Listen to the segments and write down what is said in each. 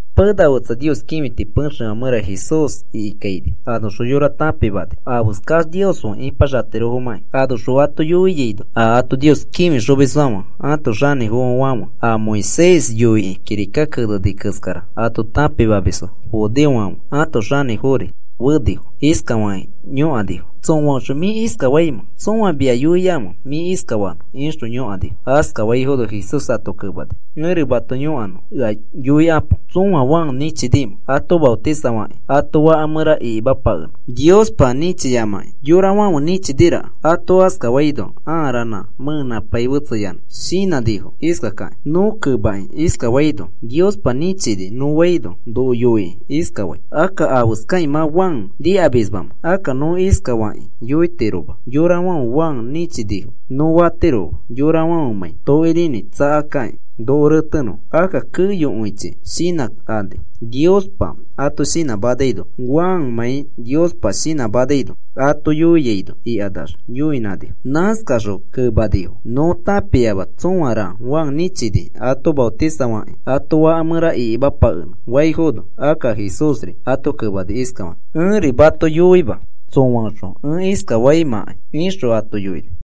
Pena fetsa Nios kĩfiti pexefã mẽra Jesús ikikaini anoxõ yorafo tãpimani afeskax Nios fe ĩpaxatirofomãkĩ. Anoxõ ato yoiaino a ato Nios kĩfixomisfãfe ãto xanĩfofo fe, a Moisés yoikĩ kirika keneni keskara ato tãpimamisfo, judeofãfe ãto xanĩfofori fenifo. Iskafakĩ yõkanifo: “¿Tsõaõxõ mĩ iskafaimẽ? ¿Tsõa mia yoiamẽ mĩ iskafanõ?” ixõ yõkanifo. Askafaifono Jesús ato kemani: “Ẽri mato yõkanõ ea yoikapo. ¿Tsõa Juan nĩchiamẽ ato maotisafakĩ ato faka mẽra ikimapakenõ? Niospa nĩchiyamakĩ yorafãfe nĩchiniforaka.” Ato askafaino ãa ranã mẽenãpai fetseyanã shinãnifo iskakakĩ: “Nõ kemakĩ iskafaino: ‘Niospa nĩchini,’ nõ faino noko yoikĩ iskafai: ‘Akka, ¿afeskakĩ mã Juan nikamismamẽ?’ Akka nõ iskafakĩ yoitiroma: ‘Yorafãfe Juan nĩchinifo,’ nõ fatiroma yorafãfemãi tokirinĩ tsakakakĩ noko retenõfo. Akka keyokõichi shinãkani Niospa ato shinãmanaino, Juanmãi Niospa shinãmanaino ato yoiaino,” ikanax yoinãnifo. Nãskaxõ kemanifo: “Nõ tãpiama tsõara Juan nĩchini ato maotisafakĩ ato faka mẽra ikimapakenõ,” faifono, akka Jesúsri ato kemani iskafakĩ: “Ẽri mato yoima tsõaõxõ ẽ iskafaimãkai,” ixõ ato yoini.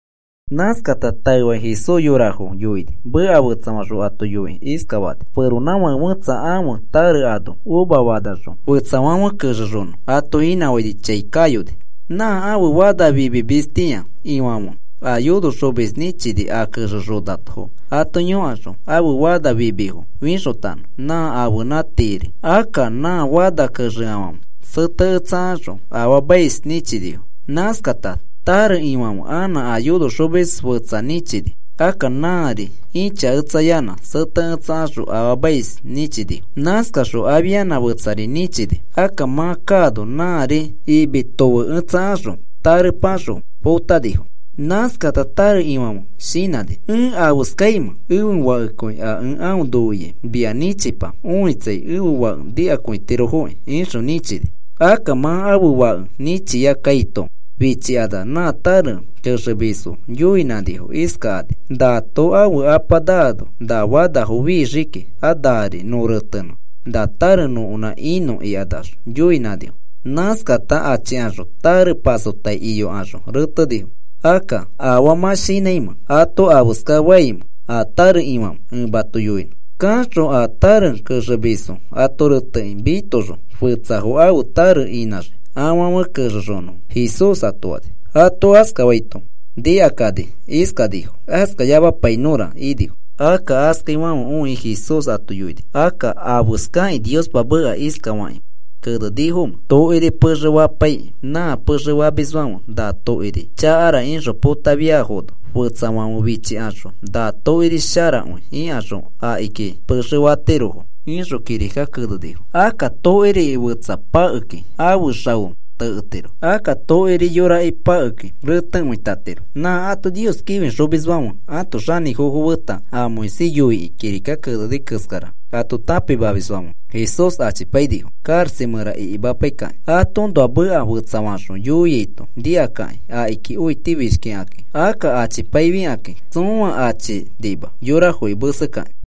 Nãskata taefakĩ Jesús yorafo yoini. Meka fetsafaxõ ato yoikĩ iskafani: “Feronãfake fẽtsa ãfe tare ano uva fanaxõ fẽtsafãfe kexexonõ ato inãfaini chai kayoni. Nã ãfe fana fimimistĩa ifãfe a yonoxomis nĩchini a kexexonafo ato yõkaxõ ãfe fana fimifo fixotanõ nã ãfenã tiiri. Akka nã fana kexeafãfe seteketsakaxõ afaamais nĩchinifo. Nãskata tare ifãfe anã a yonoxomis fetsa nĩchini. Akka nãari ĩchaketsayanã seteketsakaxõ afaamais nĩchinifo. Nãskaxõ afianã fetsari nĩchini. Akka mã kaano nãri imi tofeketsakaxõ tarepaxõ potanifo. “Nãskata tare ifãfe shinãni: ‘¿Ẽ afeskafaimẽ? Ẽfe fakekõi a ẽ aõ noiai mia nĩchipa, õitsai ẽfe fake nikakõitirofoki,’ ixõ nĩchini. Akka mã ãfe fake nĩchia kaito fichikanax nã tare kexemisfo yoinãnifo iskakani: ‘Nato ãfe apa naano na fanafo fixii kiki. A nari nõ retenõ na tare nõkonã inõ,’ ikax yoinãnifo. Nãskakata achikaxõ tare pasotai iyokaxõ retenifo. Akka, ¿afaa mã shinãimẽ ato afeska faimẽ a tare ifãfe? Ẽ mato yoinõ. Kaxõ a tare kexemisfo ato retekĩ mitoxõ, fetsafo ãfe tare inãxii afãfe kexexonõfo,” Jesús ato fani. Ato askafaito nikakani iskanifo: “Askayamapainõra,” inifo. Akka askaifãfe õikĩ Jesús ato yoini: “Akka, ¿afeskakĩ Niospa meka iskafakĩ kenenifomẽ? Tokiri pexe fapaikakĩ nã pexe famisfãfe na tokiri chakara ixõ potafiafono, fetsafãfe fichikaxõ na tokiri sharakõi ikaxõ akiki pexe fatirofo, ixõ kirikaki kenenifo. Akka tokiriki fetsa pakekĩ aõ xao teketiro. Akka tokiri yoraki pakekĩ renekõitatiro.” Nã ato Nios kĩfixomisfãfe ãto xanĩfofo feta a Moisés yoikĩ kirika keneni keskara ato tãpimamisfãfe Jesús achipainifo karaxa mẽra ikimapaikakĩ. Atoõnoa meka fetsafaxõ yoiaito nikakakĩ akiki õitifishkikaki. Akka achipaifikakĩ tsõa achinima yorafoki mesekakĩ.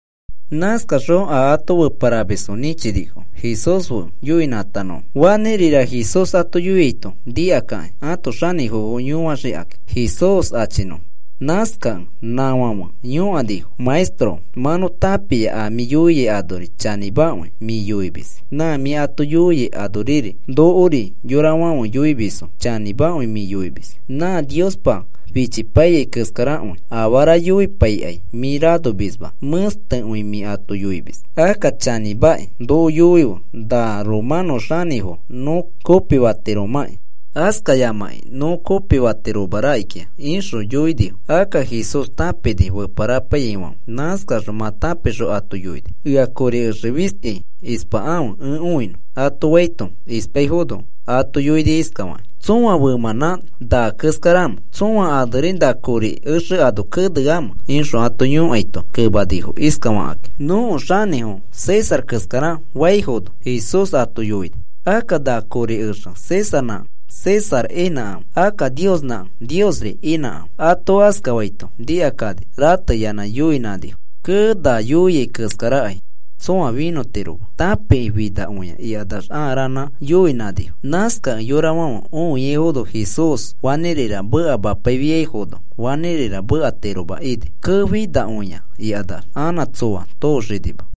Nãskakaxõ a ato feparamisfo nĩchinifo Jesús fe yoinãtanõfo fanĩrira Jesús ato yoiaito nikakakĩ ãto xanĩfofo yoixikakĩ Jesús achinõfo. Nãskakẽ nãfãfe yõkanifo: “Maestro, mã nõ tãpia a mĩ yoiai anori chanĩmakõi mĩ yoimis. Nã mĩ ato yoiai anoriri, nokori yorafãfe yoimisfo. Chanĩmakõi mĩ yoimis nã Niospa fichipaiyai keskarakõi. Afara yoipaikai mĩ ranomisma, mẽstekõi mĩ ato yoimis. Akka chanĩmamakĩ noko yoife na romanõ xanĩfo nõ kopifatiromãki askayamakĩ nõ kopifatiroma rakikĩa,” ixõ yoinifo. Akka Jesús tãpini feparapaiyaifãfe. Nãskaxõ mã tãpixõ ato yoini, “Ea kori exe fisti ispakãfe ẽ õinõ,” ato faito ispaifono ato yoini iskafakĩ: “¿Tsõa femãnã na keskaramẽ? ¿Tsõa aneri na kori exe ano keneamẽ?” ixõ ato yõkaito kemanifo iskafakakĩ: “Nõko xanĩfo César keskara,” faifono, Jesús ato yoini: “Akka na kori exe Césarnãkẽ César inãkãfe, akka Niosnãkẽ Niosri inãkãfe.” Ato askafaito nikakani, rateyanã yoinãnifo: “Kee, na yoiai keskarakai tsõa finõtiroma. Tãpikĩ finakõia,” ikanax ãa ranã yoinãnifo. Nãskakẽ yorafãfe õiaifono Jesús fanĩrira mekamapaifiaifono fanĩrira mekatiroma ini. “Kee, finakõia,” ikanax anã tsoa tooxinima.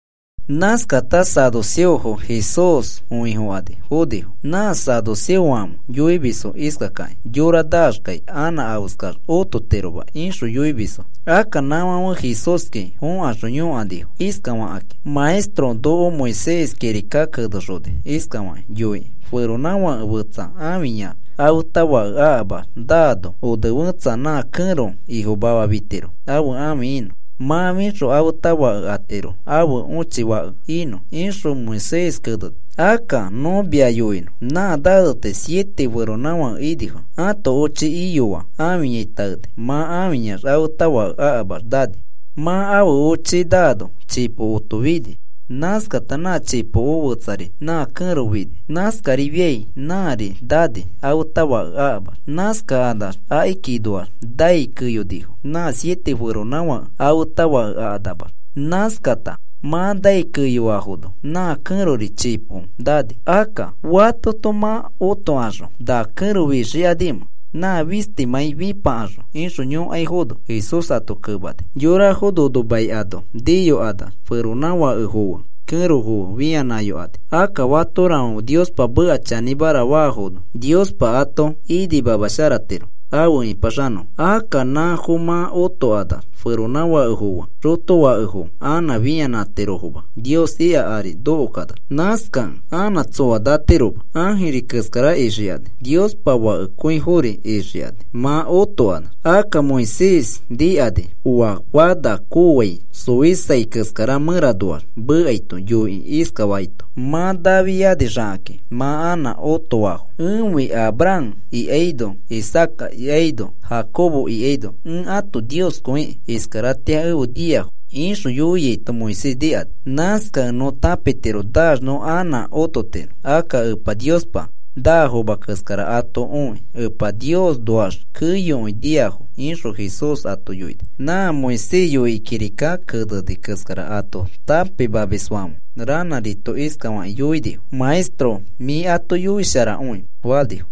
Nãskata saduceofo Jesús õifokani fonifo. Nã saduceofãfe yoimisfo iskakakĩ: “Yora naaxkai anã afeskax ototiroma,” ixõ yoimisfo. Akka nãfãfe Jesúski fõkaxõ yõkanifo iskafakakĩ: “Maestro, noko Moisés kirika kenexoni iskafakĩ yoikĩ: ‘Feronãfake fetsa ãfiyax afeta fake akamax naano one fẽtsa nã kẽro ifomafa fitiro ãfe ãfi inõ. Mã fixõ afeta fake atiro ãfe õchi fake inõ,’ ixõ Moisés keneni. Akka nõ mia yoinõ, nã naneti siete feronãfake inifo. Ãto ochi iyoa ãfiyai taeni. Mã ãfiyax afeta fake akamax nani. Mã ãfe ochi naano chipokoto fini. Nãskata nã chipoko fẽtsari nã kẽro fini. Nãskarifiai nãari nani afeta fake akamax. Nãskakanax akikinoax nai keyonifo nã siete feronãfake afeta fake akanamax. Nãskata mã nai keyoafono nã kẽrori chipo nani. Akka, ¿fatoto mã otokaxõ na kẽro fixikanimẽ, nã fistimãi fĩpakaxõ?” ixõ yõkaifono, Jesús ato kemani: “Yorafo nono mai ano niyokanax feronãfakefo fe kẽrofo fianãyokani. Akka fatorafãfe Niospa meka chanĩmara faafono Niospa ato imasharatiro afe ĩpaxanõfo. Akka nãfo mã otokanax feronãfakefo fe xotofakefo anã fĩanãtirofoma Nios ika ari nokokanax. Nãskakẽ anã tsoa natiroma. Ãjirifo keskara ixikani Niospa fakekõifori ixikani mã otokanax. Akka Moisés nikani oa fana kooai xoisai keskara mẽranoax mekaito, yoikĩ iskafaito: ‘Mã nafianixakakĩ mã anã otoafo, ẽfi Abraham ikaino Isaaca ikaino, Jacobo ikaino, ẽ ãto Nioskõiki. Iskaratĩa efe niafo,’ ixõ yoiaito Moisés nikani. Nãskakẽ nõ tãpitiro naax nõ anã ototiro. Akka Epa Niospa naafoma keskara ato õi Epa Niosnoax keyokõi niafo,” ixõ Jesús ato yoini. Nã Moisés yoikĩ kirika keneni keskara ato tãpimamisfãfe ranãrito iskafakĩ yoinifo: “Maestro, mĩ ato yoisharakõi,” fanifo.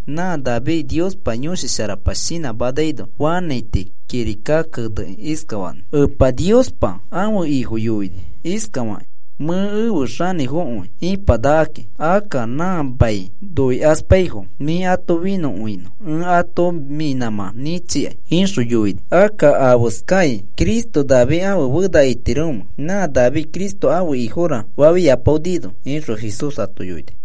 Nã David Niospa Yõshi Sharapa shinãmanaino fanãiti kirika keneni iskafaki: Epa Niospa ẽfe Ifo yoini iskafakĩ: ‘Mĩ efe xanĩfokõi ĩpanakaki. Akka nã mia noikaspaifo mĩ ato finõkõinõ ẽ ato mĩ nãmã nĩchikai,’ ixõ yoini. Akka, ¿afeskai Cristo David ãfe fena itiromẽ, nã David Cristo ẽfe Ifora fafiapaonino?” ixõ Jesús ato yoini.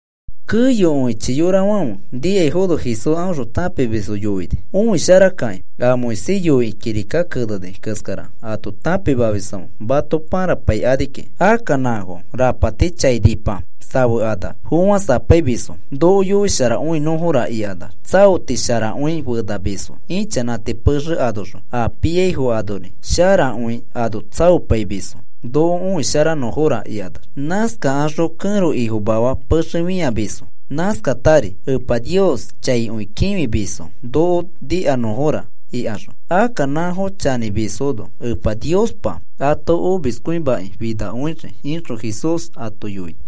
Keyokõichi yorafãfe nikaifono Jesús aõxõ tãpimisfo yoini, “Õisharakakĩ. A Moisés yoikĩ kirika keneni keskara ato tãpimamisfãfe mato pãrapaikani kiki. Akka nãfo rapati chainipa safekanax fofãsapaimisfo. ‘Noko yoisharakõinõfora,’ ikanax tsaoti sharakõi fenamisfo ĩchanãti pexe anoxõ, a piaifo anori sharakõi ano tsaopaimisfo, ‘Noko õisharanõfora,’ ikanax. Nãskakaxõ kẽro ifomafa pexe fĩamisfo. Nãskatari Epa Nios chaikõi kĩfimisfo, ‘Noko nikanõfora,’ ikaxõ. Akka nãfo chanĩmisfono Epa Niospa ato omiskõimakĩ finakõixii,” ixõ Jesús ato yoini.